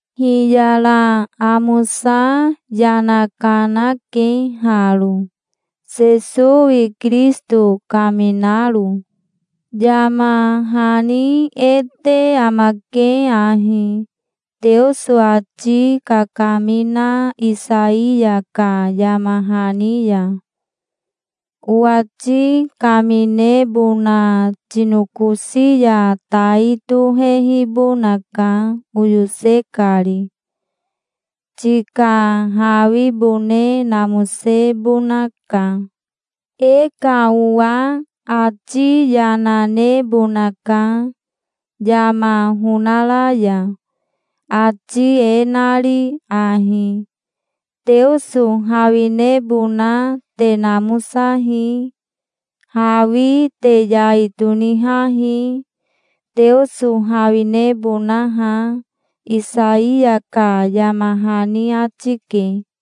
Hiyara amosa yana kanake haro, Sesowi Kirisito kaminaro. Yama hani e te amake ahi, Teoso ati kakamina Isaiya ka yama hani ya: "Owati kaminebona tinokosi ya tai tohehibonaka, oyose kari. Tika hawibone namosebonaka. E ka owa ati yana nebonaka yama honara ya, ati e nari ahi: 'Teoso hawinebona te namosahi. Hawi te yai tonihahi, Teoso hawinebonaha'", Isaiya ka yama hani ati ke.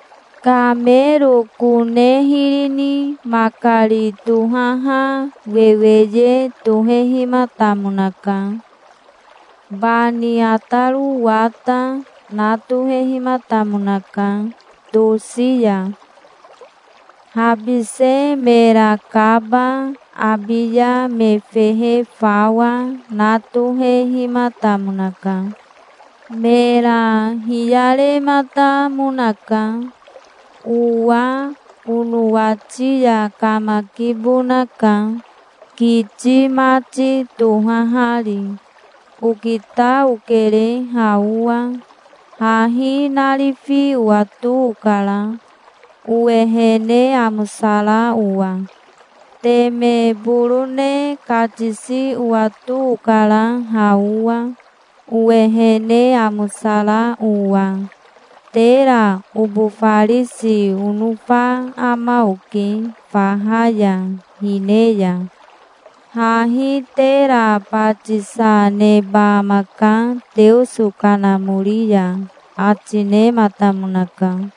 Kamero kone hiri ni makari tohaha weweye tohehimatamonaka. Bani ataro wata, na tohehimatamonaka tosi ya. Habise mera kaba, abiya me fehe fawa, na tohehimatamonaka. Mera hiyarematamonaka. "Owa onowati ya kamakibonaka, kiti mati tohahari. Okita okere, ha owa. Hahi narifi owato okara, owehene amosara owa. Teme borone katisi owato okara ha owa, owehene amosara owa Tera obofarisi onofa ama oke, faha ya hine ya. Hahi tera batisa neba amaka Teoso Kanamori ya", ati nematamonaka.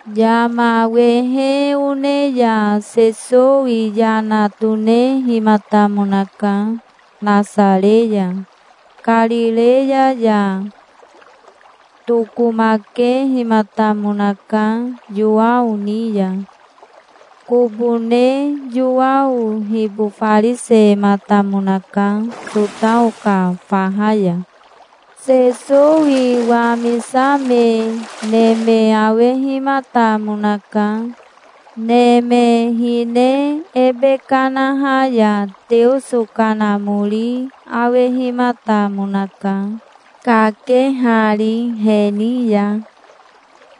Yama wehe one ya Sesowi yana tonehimatamonaka, Nasare ya, Karireya ya. Tokomakehimatamonaka Yowao ni ya. Kobo ne Yowao hibofarisematamonaka, Sotao ka faha ya. Sesowi wamisame neme awehimatamonaka. Neme hine ebe kanaha ya Teoso Kanamori awehimatamonaka, kakehari he ni ya,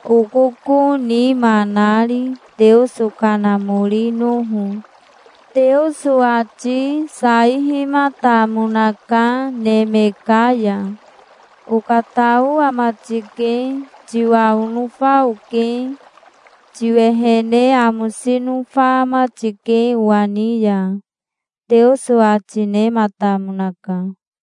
okoko nima nari, Teoso kanamorinoho. Teoso ati saihimatamonaka neme ka ya. "Okatao ama tike. Tiwa onofa oke. Tiwehene amosi nofa ama tike owa ni ya", Teoso ati nematamonaka.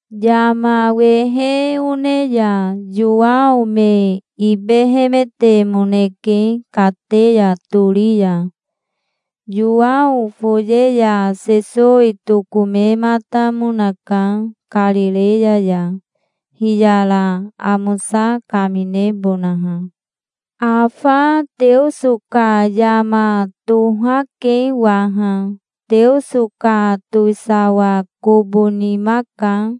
Yama wehe one ya Yowao me ibehemetemoneke kateya tori ya. Yowao foye ya Sesowi tokomematamonaka Karireya ya, hiyara amosa kaminebonaha. "Afa Teoso ka yama tohake waha. Teoso ka towisawa kobo nima ka.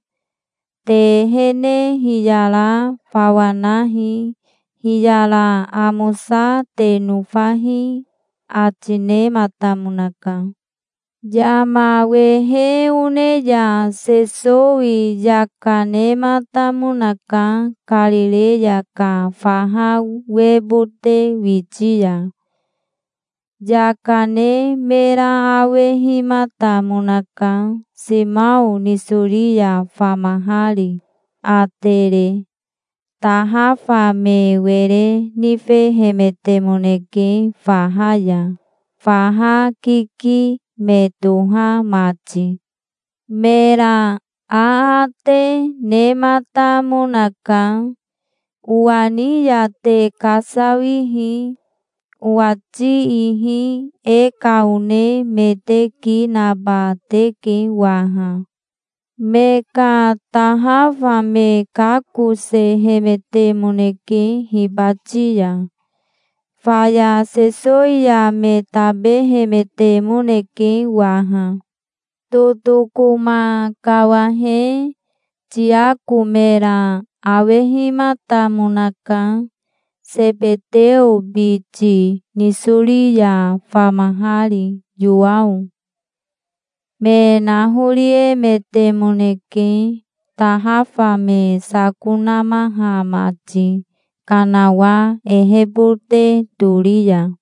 Te ehene hiyara fawa nahi. Hiyara amosa te nofahi", ati nematamonaka. Yama wehe one ya Sesowi yaka nematamonaka Karireya ka faha webote witi ya. Yaka ne mera awehimatamonaka, Simao nisori ya famahari, Atere. Tahafa me were nifehemetemoneke faha ya, faha kiki me toha mati. Mera aate nematamonaka. "Owa ni ya te kasawihi. Owati ihi e ka one me te ki naba teke waha". Me ka tahafa me kakosehemetemoneke hibati ya. Faya Sesowi ya me tabehemetemoneke waha. Totokoma kawahe Tiako mera awehimatamonaka, Sebeteo biti, nisori ya famahari, Yowao. Me nahoriemetemoneke, tahafa me sako namaha mati kanawa ehebote tori ya.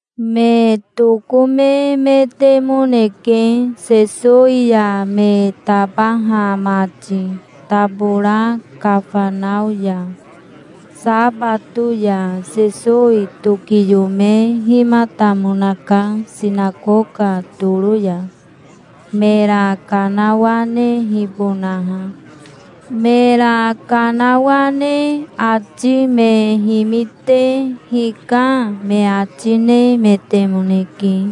Me tokomemetemoneke Sesowi ya me tabaha mati, tabora Kafanao ya. Sabato ya Sesowi tokiyomehimatamonaka sinakoka toro ya, mera kanawanehibonaha. Mera kanawane ati me himite 'Hika', me ati nemetemoneke,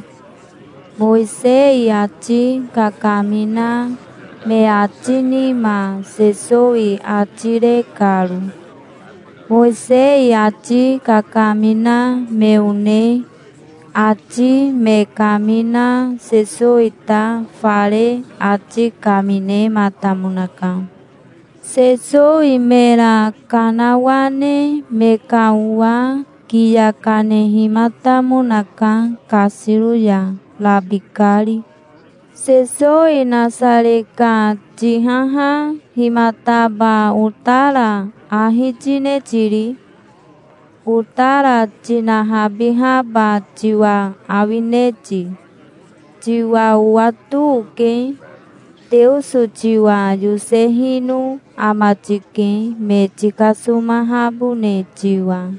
Mowisei ati kakamina me ati nima Sesowi ati re karo. Mowisei ati kakamina me one ati me kamina Sesowi ta fare ati kaminematamonaka. Sesowi mera kanawane me ka owa kiya kanehimatamonaka kasiro ya, rabikari. "Sesowi Nasare ka tihaha himataba otara ahi tine tiri? Otara tinahabihaba tiwa awine ti? Tiwa owato oke. Teoso tiwa yosehino ama tike, me tikasomahabone tiwa.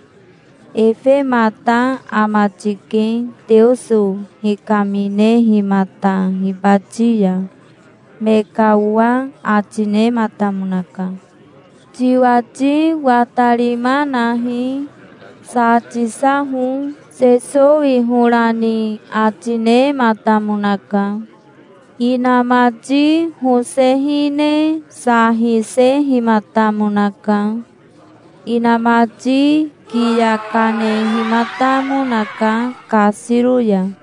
Efemata ama tike, Teoso hikaminehimata hibati ya", me ka owa ati nematamonaka. "Tiwati watarima nahi. Sa tisaho", Sesowi hora ni ati nematamonaka. Inamati hose hine sa hisehimatamonaka. Inamati kiya kanehimatamonaka kasiro ya.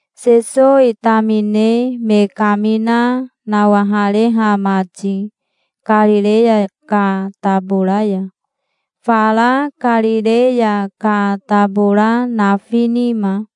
Sesowi tamine me kamina nawahareha mati Karireya ka tabora ya, fara Karireya ka tabora nafi nima.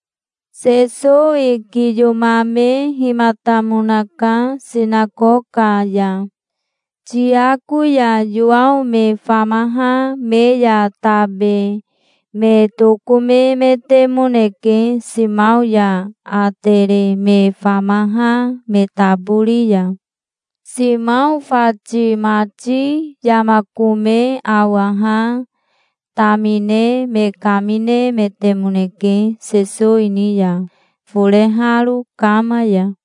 Sesowi kiyomamehimatamonaka sinakoka ya. Tiako ya Yowao me famaha me ya tabe me tokomemetemoneke Simao ya Atere me famaha me tabori ya. Simao fati mati yama kome awaha tamine me kaminemetemoneke Sesowi ni ya, foreharo kama ya.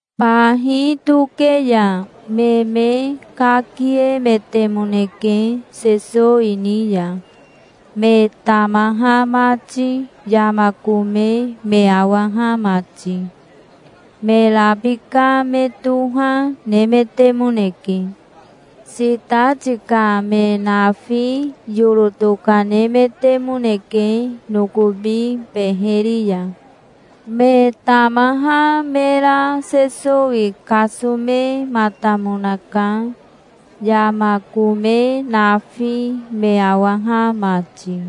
Bahi toke ya me me kakiemetemoneke Sesowi ni ya, me tamaha mati, yama kome me awaha mati. Me rabika me toha nemetemoneke. Sitati ka me nafi yoro tokanemetemoneke nokobi beheri ya. Me tamaha mera Sesowi kasomematamonaka, yama kome nafi me awaha mati.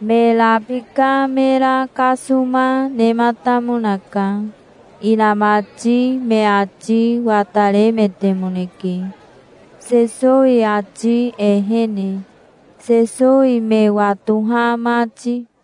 Me rabika mera kasoma nematamonaka. Inamati me ati wataremetemoneke, Sesowi ati ehene, Sesowi me watoha mati.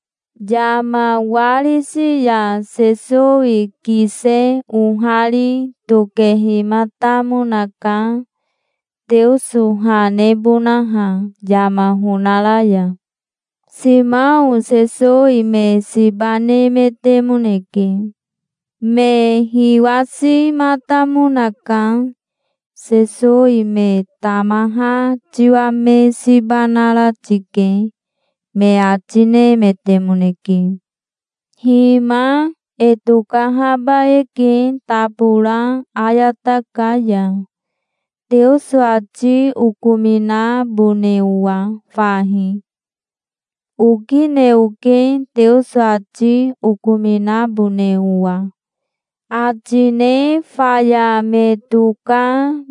Yama warisi ya Sesowi kise ohari tokehimatamonaka, Teoso ha nebonaha yama honara ya. Simao Sesowi me siba nemetemoneke. Me hiwasimatamonaka. "Sesowi me tamaha tiwa me siba nara tike", me ati nemetemoneke. "Hima e tokahaba eke tabora ayata ka ya, Teoso ati okominabone owa fahi. Okine oke Teoso ati okominabone owa", ati ne faya me toka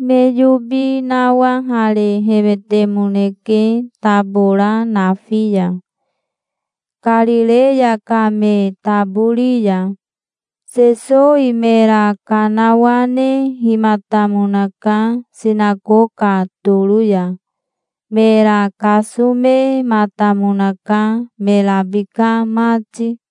me yobi nawaharehemetemoneke tabora nafi ya, Karireya ka me tabori ya. Sesowi mera kanawanehimatamonaka sinakoka toro ya. Mera kasomematamonaka me rabika mati.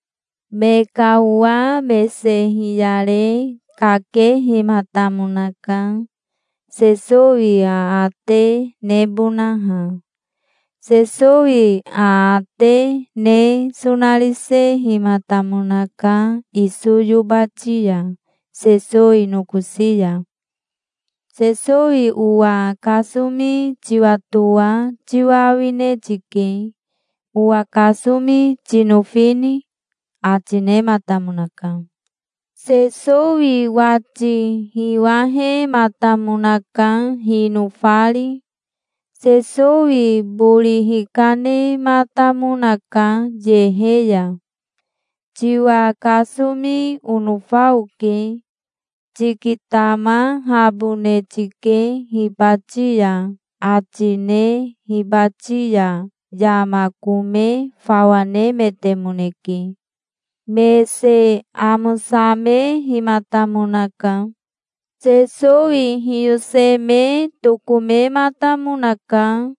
Me ka owa mese hiyare kakehimatamonaka, Sesowi aate nebonaha. Sesowi aate ne sonarisehimatamonaka iso yobati ya Sesowi nokosi ya. "Sesowi owa kasomi tiwatoa tiwa awine tike. Owa kasomi tinofini?", ati nematamonaka. Sesowi wati hiwahematamonaka hinofari. Sesowi bori hikanematamonaka yehe ya. "Tiwa kasomi onofa oke. Tikitamahabone tike hibati ya", ati ne hibati ya yama kome fawa nemetemoneke. Mese amosamehimatamonaka. Sesowi hiyoseme tokomematamonaka.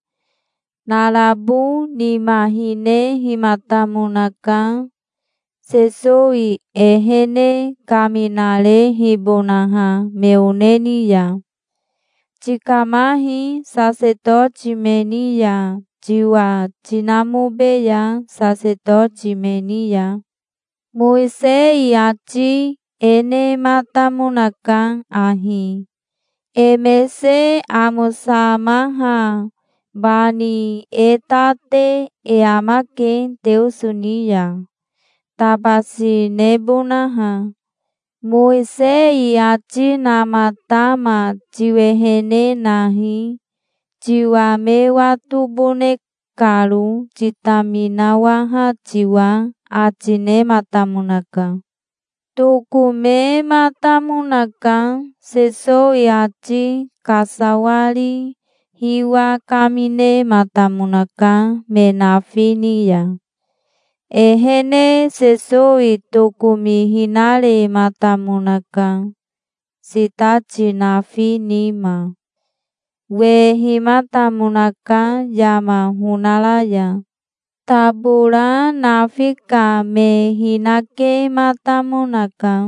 Narabo nima hinehimatamonaka, Sesowi ehene kaminarehibonaha me one ni ya. "Tikamahi sasetoti me ni ya, tiwa tinamobeya sasetoti me ni ya. Mowisei ati e nematamonaka ahi: E mese amosamaha bani e ta te e amake Teoso ni ya, tabasi nebonaha. Mowisei ati namatama tiwehene nahi, tiwa me watobone karo, titaminawaha tiwa", ati nematamonaka. Tokomematamonaka. Sesowi ati kasawari hiwa kaminematamonaka me nafi ni ya. Ehene Sesowi tokomihinarematamonaka, sitati nafi nima. Wehimatamonaka yama honara ya. Tabora nafi ka me hinakematamonaka.